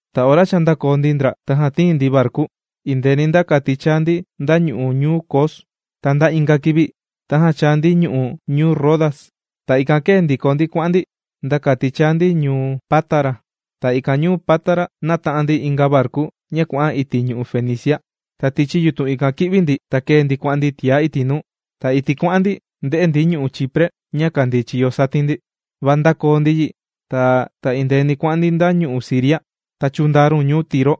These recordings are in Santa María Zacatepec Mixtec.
Ta ora cha ndākoo ndio ndi ndra, tajan tīin ndi varku indeeni nda kati chāa ndi nda ñu'u' ñuu Cos. Ta nda inga kivi, tajan chāa ndi ñu'u' ñuu Rodas. Ta ikan kēe ndiko ndi kuà'an ndi nda kati chāa ndi ñuu Pátara. Ta ikan ñuu Pátara, nāta'an ndi inga varku ña kuà'an iti' ñu'u' Fenicia. Ta tichi yutun ikan kī'vi ndi ta kēe ndi kuà'an ndi tiá iti' nuu. Ta iti' kuà'an ndi ndē'e ndi ñu'u' Chipre ña kàndii chiyo satin ndi. Va ndākoo ndi yi, ta indeeni kuà'an ndi nda ñu'u' Siria, ta chūndaa run ñuu Tiro.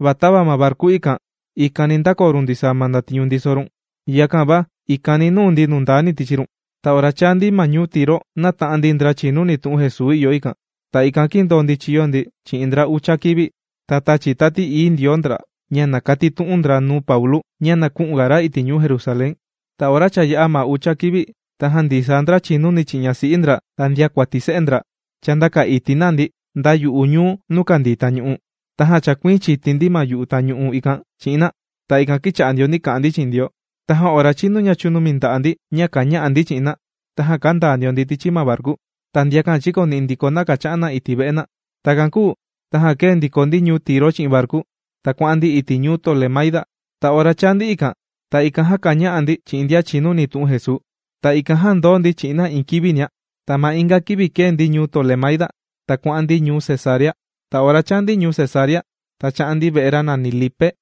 Va tava ma varku ikan, ikani ndākoo run ndisaa ma ndatiñu ndiso run, yakan va ikan nūu ndi tichi run nundani ndia. Ta ora chāa ndi ma ñuu Tiro nāta'an ndi ndra chìnuni tu'un Jesuu ìyo ikan. Ta ikan kīndoo ndi chīyo ndi chi'in ndra ucha kivi. Ta tāchi Tati Ií Ndioo ndra ña na katitu'un ndra nuu Paulu ña na kü'un ga ra iti' ñuu Jerusalén. Ta ora cha yā'a ma ucha kivi, tajan ndisaa ndra chìnuni chi'in ñasi'i ndra ta ndiakuati se'e ndra, chāndaka iti' na ndi nda yu'u ñuu nuu kàndii tañu'u. Tajan chākuiin chiti ndi ma yu'u tañu'u ikan chi'in na. Ta ikan kīcha'a ndio ndi kā'an ndi chi'in Ndioo. Tajan ora chīnu ña chūnumi nda'a' ndi ña kàña'a ndi chi'in na, tajan kāndaa ndio ndi tichi ma varku, ta ndiakan chīkoni'i ndiko na kàcha'an na iti' ve'e na. Takan kūu tajan kēe ndiko ndi ñuu Tiro chi'in varku. Ta kuà'an ndi iti' ñuu Tolemaida. Ta ora chāa ndi ikan, ta ikan jan káña'a ndi chi'in ndian chìnuni tu'un Jesuu. Ta ikan jan kīndoo ndi chi'in na iin kivinia. Ta ma inga kivi kēe ndi ñuu Tolemaida, ta kuà'an ndi ñuu Cesarea. Ta ora chāa ndi ñuu Cesarea, ta chā'an ndi ve'e ra nàni Lipe,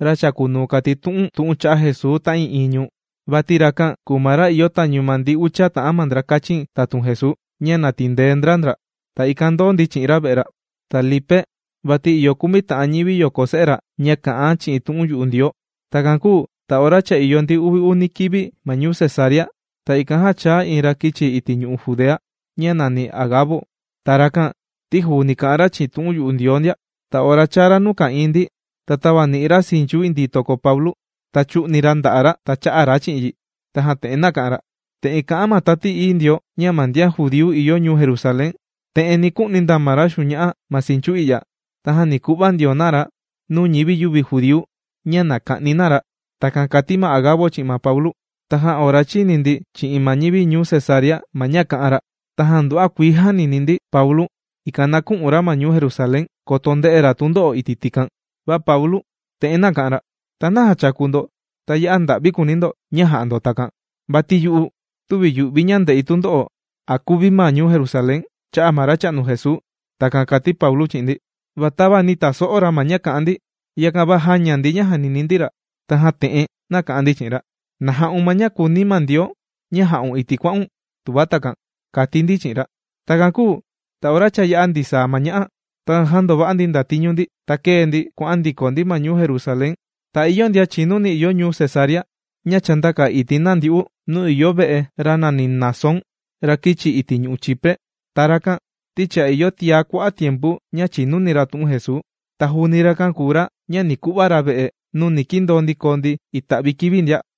ra chàkunuu kàtitu'un tu'un cha'a' Jesuu ta'ii'iin ñuu. Vati rakan, kùu ma ra ìyo tañu ma ndi ucha ta'an ndra kāchin tatun Jesuu ña na tindee ndra ndra. Ta ikan ndōo ndi chi'in ra ve'e ra. Ta Lipe vati ìyo kumi ta'an ñivi yoko se'e ra ña kà'an chi'in tu'un yu'u Ndioo. Takan kūu ta ora cha ìyo ndi uvi uni kivi ma ñuu Cesarea, ta ikan jan chāa iin ra kīchi iti' ñu'u' Judea ña nàni Agabo. Ta rakan ti juuni kà'an ra chi'in tu'un yu'u Ndioo ndia. Ta ora chāa ra nuu ka'ìin ndi, ta tāvani'i ra sinchu indii toko Paulu. Ta chū'ni ra nda'a' ra ta cha'a ra chi'in yi. Tajan te'en nāka'an ra: ―Te'en kā'an ma Tati Ií Ndioo, ña ma ndian judíu ìyo ñuu Jerusalén, te'en ni ku'ni na ma ra xuña'a ma sinchu i'ya, tajan ni ku'va ndio na ra nuu ñivi yüvi judíu ña na ka'ni na ra. ―Takan kàti ma Agabo chi'in ma Paulu. Tajan ora chīni ndi chi'in ma ñivi ñuu Cesarea ma ña kā'an ra, tajan nduva'a kuii jānini ndi Paulu, ikan na kü'un ra ma ñuu Jerusalén koto nde'e ra tundo'o iti' tikan. Va Paulu te'en nāka'an ra: ―¿Ta naja chàku ndo, ta ya'a nda'vi kùuni̱ ña jà'a ndo takan? Vati yu'u tüvi yù'vi ña nde'i tundo'o, a kuvi̱ ma ñuu Jerusalén cha'a' ma Racha'nu Jesuu. ―Takan kàti Paulu chi'in ndi. Va tava nī taso'o ra ma ña kā'an ndi, yakan va jāña ndi ña jànini ndi ra. Tajan te'en nāka'an ndi chi'in ra: ―¡Na ja'un ma ña kùuni Ndioo ña ja'un iti' kuà'un, tuva takan! ―kàti ndi chi'in ra. Takan kūu ta ora cha yā'a ndisaa ma ña'a, tajan jāndova'a ndi ndatiñu ndi, ta kēe ndi kuà'an ndiko ndi ma ñuu Jerusalén. Ta ìyo iin ndian chìnuni ìyo ñuu Cesarea ña chāndaka iti' na ndyu'u nuu ìyo ve'e ra nàni Mnasón, ra kīchi iti' ñu'u' Chipre. Ta rakan ti cha ìyo tiaga kua'a' tiempu ña chìnuni ra tu'un Jesuu. Ta juuni rakan kùu ra ña ni ku'va ra ve'e nuu ni kindoo ndi koo ndi ita'vi kivi ndia.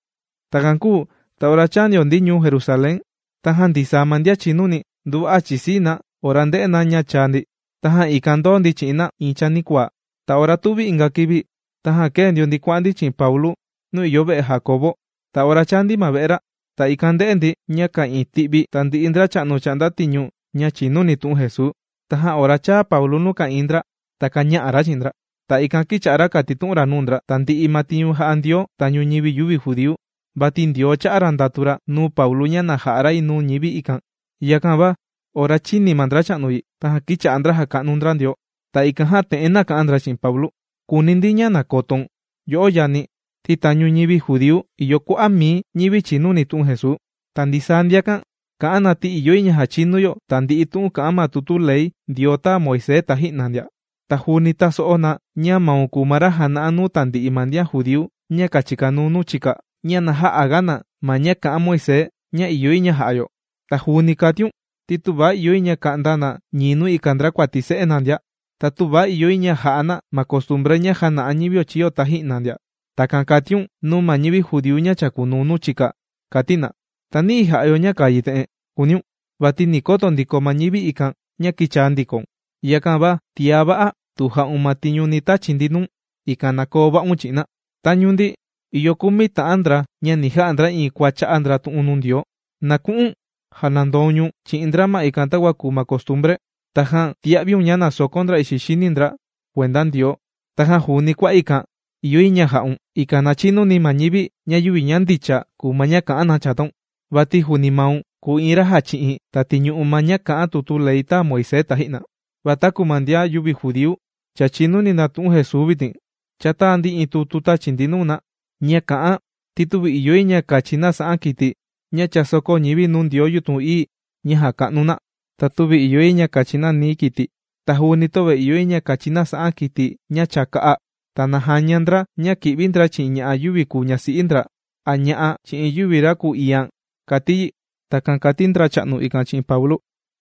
Takan kūu ta ora chāa ndio ndi ñuu Jerusalén, tajan ndisaa ma ndian chìnuni nduva'a chìsii na ora ndē'e na ña chāa ndi. Tajan ikan ndōo ndi chi'in na iin chanikuaa. Ta ora tuvi inga kivi tajan kēe ndio ndi kuà'an ndi chi'in Paulu nuu ìyo ve'e Jandiau. Ta ora chāa ndi ma ve'e ra, ta ikan ndē'e ndi ña ka'ìin ti'vi tandi'i ndracha'nu chà'nda tiñu ña chìnuni tu'un Jesuu. Tajan ora chāa Paulu nuu ka'ìin ndra, ta kāña'a ra chi'in ndra. Ta ikan kīcha'a ra kàtitu'un ra nuu ndra tandi'i ma tiñu jà'a Ndioo tañu ñivi yüvi judíu, vati Ndioo chā'a ra ndatu ra nuu Paulu ña na ja'a ra yi nuu ñivi ikan. Yakan va ora chīni ma ndracha'nu yi, tajan kīcha'a ndra jàka'nu ndra Ndioo. Ta ikan jan te'en nāka'an ndra chi'in Paulu: ―Kùuni ndi ña na kotoun, yo'o yani, ti tañu ñivi judíu, ìyo kua'a' mii ñivi chìnuni tu'un Jesuu. Ta ndisaa ndiakan, kà'an na ti ìyo yi ña jachinu yo tandi'i tu'un kà'an ma tutu ley Ndioo tāa Moisés taji'na ndia. Ta juuni tāso'o na ña maun kùu ma ra jàna'a nuu tandi'i ma ndian judíu ña kàchikanuu nuu chika ña na jä'aga na ma ña kà'an Moisés ña ìyo yi ña ja'a yo. Ta juuni kàtiun ti tüva ìyo yi ña ka'nda na ñii nuu ika ndrakuati se'e na ndia. Ta töva ìyo yi ña ja'a na ma costumbre ña jāna'a ñivio chīyo taji'na ndia. Takan kàtiun nuu ma ñivi judíu ña kàchikanuu nuu chika, kàti na. ¿Ta nayi jà'a yo ña kàa yi te'en?, kùuniun. Vati ni koto ndiko ma ñivi ikan ña kīchaa ndikoun. Yakan va tiá va'a tu ja'un ma tiñu ni tachi ndi nuu̱n, ikan na koo va'un chi'in na. Tañu ndi ìyo kumi ta'an ndra ña ni ja'a ndra iin kua chā'a ndra tu'un nuu Ndioo. Na ku'u̱n janandoun ñu̱n chi'in ndra ma ikan takua kùu ma costumbre. Tajan tia'viun ña na sokon ndra ixi xini ndra kuenda Ndioo. Tajan juuni kua ikan ìyo yi ña ja'un, ikan na chinuni ma ñivi ña yüvi ña ndicha kùu ma ña kà'an na chataun. Vati juuni maun kùu iin ra jàchi'in ta tìñu'u ma ña kà'an tutu ley tāa Moisés taji'na. Va taku ma ndian yüvi judíu cha chìnuni na tu'un Jesuu vitin, cha tāa ndi iin tutu tāchi ndi nuu na ña kà'an ti tüvi ìyo yi ña kachi na sa'an kiti ña cha sōkó ñivi nuu ndioo yutun ií ña jàka'nu na. Ta tüvi ìyo yi ña kachi na nií kiti, ta juuni tüvi ìyo yi ña kachi na sa'an kiti ña cha kā'a. Ta na jaña ndra ña kì'vi ndra chi'in ña'a' yüvi ñasi'i ndra a ña'a chi'in yüvi ra kùu iian, kàti yi. ―Takan kàti ndracha'nu ikan chi'in Paulu.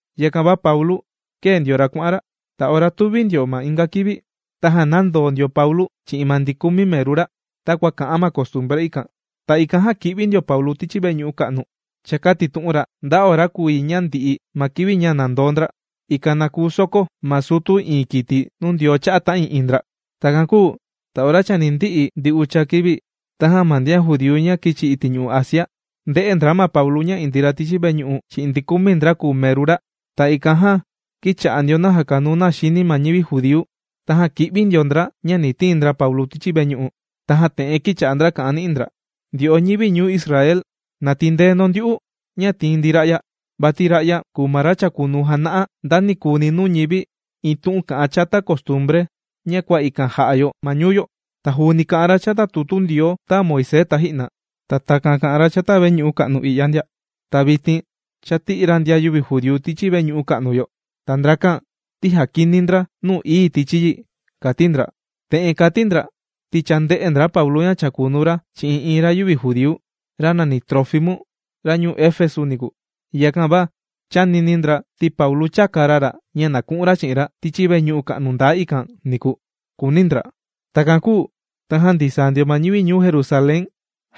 Yakan va Paulu kēe ndio ra kuà'an ra. Ta ora tuvi ndio ma inga kivi, tajan nāndoo ndio Paulu chi'in ma ndi kumi meru ra takua kà'an ma costumbre ikan, ta ikan jan kī'vi ndio Paulu tichi veñu'u ka'nu chākatitu'un ra nda ora kùu yi ña ndi'i ma kivi ña nàndoo ndra, ikan na kuu sokó ma sutu iin kiti nuu Ndioo cha'a' ta'ii'iin ndra. Takan kūu ta ora chani ndi'i ndi ucha kivi, tajan ma ndian judíu ña kīchi ñu'u' Asia ndē'e ndra ma Paulu ña indii ra tichi veñu'u chi'in ndi kumi ndra kùu meru ra. Ta ikan jan kīcha'a ndio na jàkanuu na xini ma ñivi judíu, tajan kī'vi ndio ndra ña ni tiin ndra Paulu tichi veñu'u. Tajan te'en kīcha'a ndra kà'an ni'i ndra: ―Ndyo'o ñivi ñuu Israel ¡na tindee ndo ndyu'u ña tìin ndi ra'ya! Vati ra'ya kùu ma ra chàkunuu jàna'a ndanikuni nuu ñivi iin tu'un kà'an chata costumbre ña kua ikan jà'a yo ma ñuu yo. Ta juuni kà'an ra chata tutu Ndioo tāa Moisés taji'na. Ta takan kà'an ra chata veñu'u ka'nu i'ya ndia. Ta vitin cha tī'i ra ndian yüvi judíu tichi veñu'u ka'nu yo. Ta ndrakan ti jàkini ndra nuu ií tichi yi ―kàti ndra. Te'en kàti ndra ti cha ndē'e ndra Paulu ña chàkunuu ra chi'in iin ra yüvi judíu, ra nàni Trófimu ra ñuu Efesu niku. Yakan va chānini ndra ti Paulu chāka ra ra ña na ku'un ra chi'in ra tichi veñu'u ka'nu ndaa ikan niku, kùuni ndra. Takan kūu tajan ndisaa ndio ma ñivi ñuu Jerusalén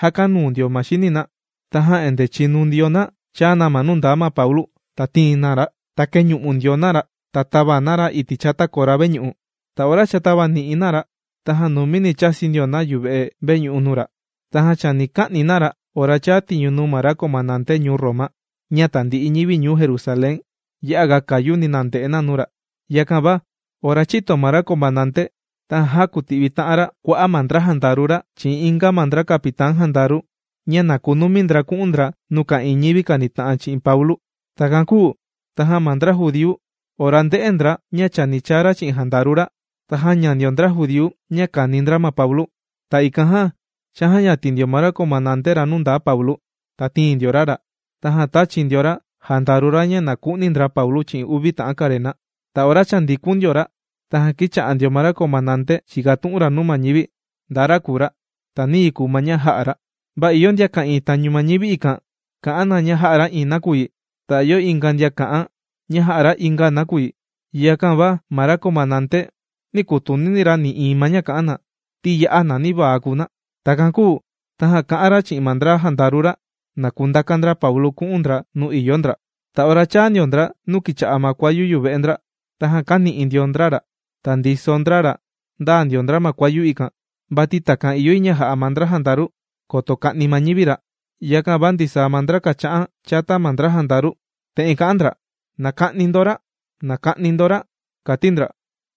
jākanuu ndio xini na. Tajan endee chìnu ndio na chāa na nuu ndaa Paulu ta tīin na ra. Ta kēñu'u ndio na ra, ta tāva na ra iti' chata kora veñu'u. Ta ora cha tāvani'i na ra, tajan numini chāsi ndio na yuve'e veñu'u nuu ra. Tajan chani ka'ni na ra ora chāa tiñu nuu ma ra comandante ñuu Roma, ña tandi'i ñivi ñuu Jerusalén ya'aga kayuni na nde'e na nuu ra. Yakan va ora chīto ma ra comandante, tajan jākuti'vi ta'an ra kua'a' ma ndra jandaru ra chi'in inga ma ndra capitán jandaru ña na kunumi ndra ku'un ndra nuu ka'ìin ñivi kànita'an chi'in Paulu. Takan kūu tajan ma ndra judíu ora ndē'e ndra ña chani chaa ra chi'in jandaru ra, ta jāña ndio ndra judíu ña kàni ndra ma Paulu. Ta ikan jan chājayatin ndio ma ra comandante nuu ndaa Paulu, ta tīin ndio ra ra, tajan tāchi ndio ra jandaru ra ña na ku'ni ndra Paulu chi'in uvi ta'an karena. Ta ora cha ndikun ndio ra, tajan kīcha'a ndio ma ra comandante chìkatu'un ra nuu ma ñivi nda ra kùu ra, ta niyi kùu ma ña jā'a ra. Va ìyo ndian ka'ìin tañu ma ñivi ikan, kà'an na ña jā'a ra iin nakuyi, ta ìyo inga ndian kà'an ña jā'a ra inga nakuyi. Yakan va ma ra comandante nī kuu kutunini ra nï'iin ma ña kà'an na, ti ya'a nanivaa kùu na. Takan kūu tajan kā'an ra chi'in ma ndra jandaru ra, na kundaka ndra Paulu ku'un ndra nuu ìyo ndra. Ta ora chāa ndio ndra nuu kìcha'a ma kuayu yuve'e ndra, tajan kāni'i ndio ndra ra, ta ndiso ndra ra ndaa ndio ndra ma kuayu ikan, vati takan ìyo yi ña jà'a ma ndra jandaru koto ka'ni ma ñivi ra. Yakan va ndisaa ma ndra kàcha'an chata ma ndra jandaru te'en kà'an ndra: ―¡Na ka'ni ndo ra! ¡Na ka'ni ndo ra! ―kàti ndra.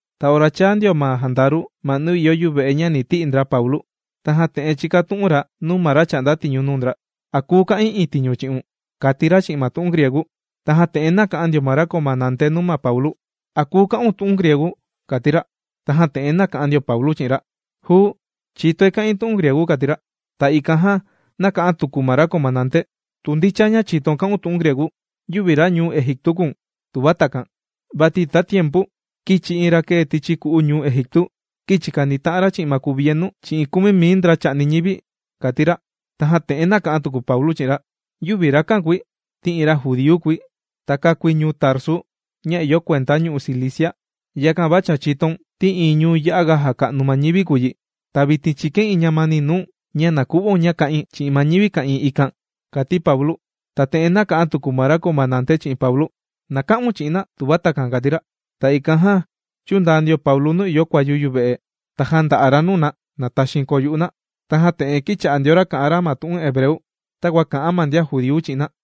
Ta ora chāa ndio ma jandaru ma nuu ìyo yuve'e ña ni ti'i ndra Paulu, tajan te'en chīkatu'un ra nuu ma ra chà'nda tiñu nuu ndra: ―¿A kùu ka'in iin tiñu chi'un? ―kàti ra chi'in ma tu'un griegu. Tajan te'en nāka'an ndio ma ra comandante nuu ma Paulu: ―¿A kùu ka'un tu'un griegu? ―kàti ra. Tajan te'en nāka'an ndio Paulu chi'in ra: ―Juu, chìtoi kà'in tu'un griegu ―kàti ra. Ta ikan jan, nāka'an tuku ma ra comandante: ―Tu ndicha ña chìtoun kà'un tu'un griegu, yüvi ra ñuu Egiptu kùu̱n, tuva takan. Vati tatiempu kīchi iin ra kēe tichi ku'u ñuu Egiptu, kīchi kanita'an ra chi'in ma kuvienu chi'in kumi mii ndra chà'ni ñivi ―kàti ra. Tajan te'en nāka'an tuku Paulu chi'in ra: ―Yüvi rakan kùi, ti iin ra judíu kùi. Ta kākui ñuu Tarsu, ña ìyo kuenda ñu'u' Cilicia. Yakan va cha chìtoun ti iin ñuu ya'aga jàka'nu ma ñivi kùu yi. Ta vitin chìkain iin ñamani nuu̱n ña na ku'vaun ña ka'in chi'in ma ñivi ka'ìin ikan ―kàti Paulu. Tajan te'en nāka'an tuku ma ra comandante chi'in Paulu: ―Na ka'un chi'in na tuva takan ―kàti ra. Ta ikan jan chūndaa ndio Paulu nuu ìyo kuayu yuve'e, ta jānda'a ra nuu na, na taxiin koo yu'u na. Tajan te'en kīcha'a ndio ra kà'an ra ma tu'un hebreu, takua kà'an ma ndian judíu chi'in na: